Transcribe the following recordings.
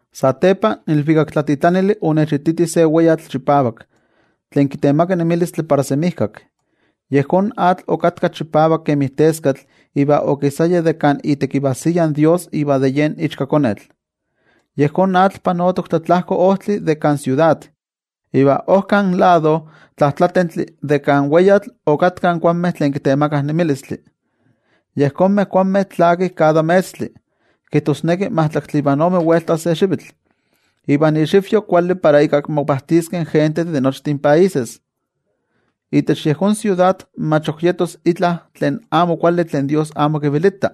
Satepa in ilvikaktlatitlanili onechititi se weyatl chipavak, tlen kitemaka nemilistli para semijkak. Yejón atl okatka chipavak kemi teskatl iva okisaya de kan itekivajsiya in toYejwatzi iva de yen Ichkakonetl. Yejón atl panotok tlatlajko ojtli de kan siudad. Iva ojkan lado tlajtlatentli de kan weyatl okatkah in kuanmeh tlen kitemakah nemilistli. Yejonmeh kuanmeh tlakih kada metztli, kijtosneki majtlaktli ivan ome welta se xivitl. Iva inxivyo kuali para ika mopajtiskeh in gentejtih de nochtin países. Itech yejón siudad mach ok yetos itla tlen amo kuali tlen toYejwatzi amo kipaktia.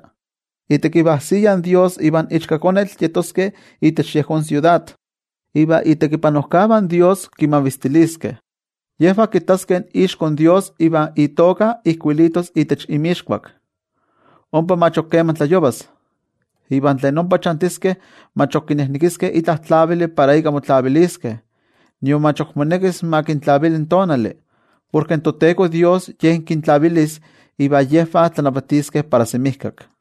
Itekivajsiya in toYejwatzi ivan Ichkakonetl yetoskeh itech yejón siudad. Iva itekipanojkavah in toYejwatzi kimavistiliskeh. Yejvah kittaskeh ixko in toYejwatzi iva itoka ijkuilitos itech inmixkuak. Ompa mach keman tlayovas. Iva tlen ompa chantiskeh mach ok kinejnekiskeh itla tlavili para ika motlaviliskeh, nion mach ok monekis ma kintlavili in tonali, porke in toTeko Dios Ye kintlavilis. Iva yejvah tlanavatiskeh para semijkak.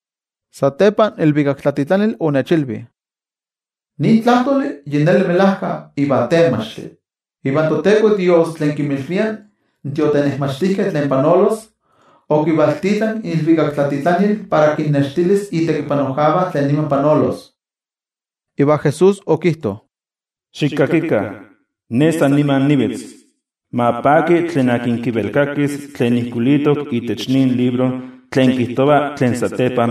Satepa in ilvikaktlatitlanili onechilvi: —Nin tlajtoli yi neli melajka iva tenmachtli. Iva toTeko Dios tlen kinmilvia in tiotenejmachtijkeh tlen panolos, okivaltitlanki iilvikaktlatitlanil para kinnextilis itekipanojkavah tlen niman panolos. Iva Jesús okijto: —¡Xikakikah! ¡Ne san nima nivitz! Ma paki tlen kivelkakis tlen ijkuilitok itech nin libro tlen panolos satepa.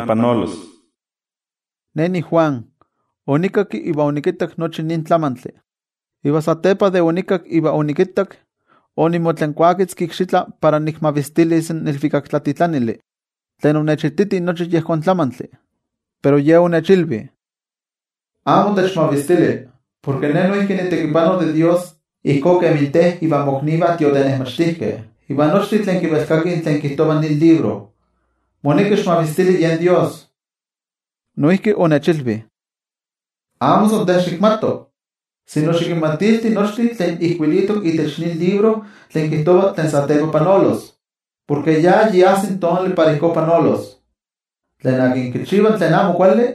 Ne niJuan, onikakki iva onikittak nochi nin tlamantli. Iva satepa de onikakki iva onikittak, onimotlankuaketzki ikxitla para nikmavistilis in ilvikaktlatitlanili, tlen onechititi nochi yejón tlamantli. Pero ye onechilvi: —Amo techmavistili. Porke ne noijki nitekipano de Dios ijkó kemi te ivan moknivah tiotenejmachtijkeh, iva nochtin tlen kivelkakih tlen kijtova nin libro. Moneki xikmavistili yen Dios. Noijki onechilvi: —Amo san te xikmato, sino xikinmatilti nochtin tlen ijkuilitok itech nin libro tlen kijtova tlen satepa panolos. Porke ya yi ajsi tonali para ijkó panolos. Tlen kichiva tlen amo kuali,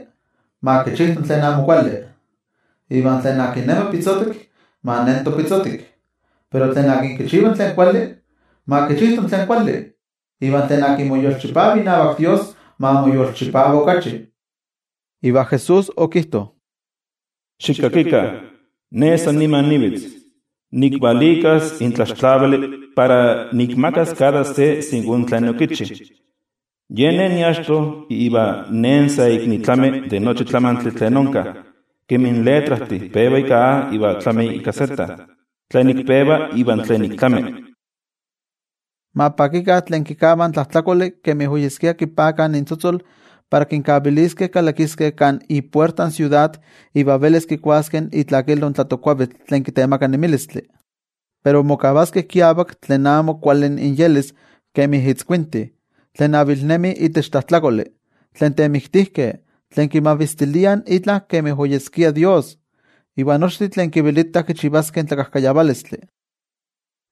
ma kichijto tlen amo kuali, iva tlen nemi pitzotik, ma nento pitzotik. Pero tlen kichiva tlen kuali, ma kichijto tlen kuali, iva tlen yomoyolchipa inavak Dios, ma moyolchipava okachi. Iva Jesús okijto: —Xikakikah. Ne san nima nivitz. Nikvalikas in tlaxtlavili para nikmakas kada se ijkó kemi tlen okichi. Yen Ne niachto iva Ne sa ik nitlami de nochi tlamantli tlen onka, kemi in letrajtih peva ika A iva tlami ika Z, tlen ik peva iva tlen ik tlami. Ma pakikah tlen kikavah in tlajtlakoli kemi oyeskia kipakah intzotzol para kinkaviliskeh kalakiskeh kan ipuerta in siudad iva velis kikuaskeh itlakilo in tlatokkuavitl tlen kitemaka nemilistli. Pero mokavaskeh kiavak tlen amo kuali inyelis kemi itzkuintih, tlen avilnemih itech tlajtlakoli, tlen temiktijkeh, tlen kimavistiliah itla tlamantli kemi oyeskia dios, iva nochtin tlen kivelitah kichivaskeh tlakajkayavalistli.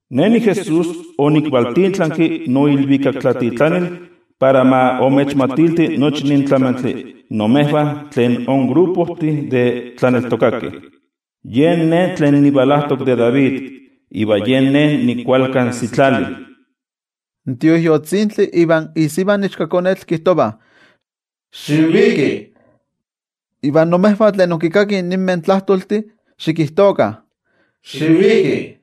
—Ne niJesús, onikvaltitlanki noilvikaktlatitlanil para ma imechmatilti nochi nin tlamantli imejvah tlen inmolololistih de tlaneltokakeh. Yen Ne tlen nivalajtok de David, iva yen Ne nikualkan sitlali. In Tioijyotzintli ivan isiva in Ichkakonetl kijtovah: —Xiviki. Iva imejvah tlen inkinkakih ninmeh tlajtoltih, xikijtokah: —Xiviki.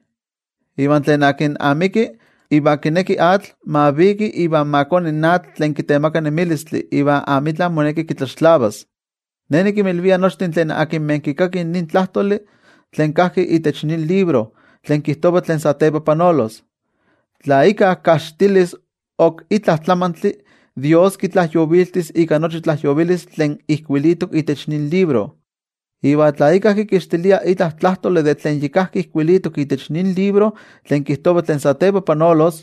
Iva tlen amiki, iva kineki atl, ma viki iva ma koni atl tlen kitemaka nemilistli iva amitla moneki kitlaxtlavas. Ne nikinmilvia nochtin tlen kikakih nin tlajtoli tlen kajki itech nin libro tlen kijtova tlen satepa panolos: Tla íkka kajxitilis ok itla tlamantli, toYejwatzi kitlajyoviltis ika nochi tlajyovilistli tlen ijkuilitok itech nin libro. Iva tla íkka kikixtilia itla tlajtoli de tlen yi kajki ijkuilitok itech nin libro tlen kijtova tlen satepa panolos,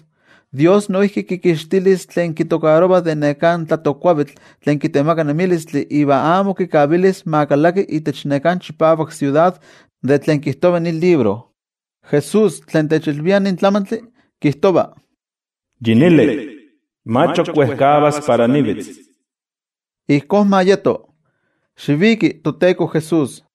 toYejwatzi noijki kikixtilis tlen kitokarova de neká tlatokkuavitl tlen kitemaka nemilistli iva amo kikavilis ma kalaki itech neká chipavak siudad de tlen kijtova nin libro. Jesús tlen techilvia nin tlamantli, kijtova: —Yi neli, mach ok wejkavas para nivitz. Ijkó ma yeto. ¡Xiviki, toTeko Jesús!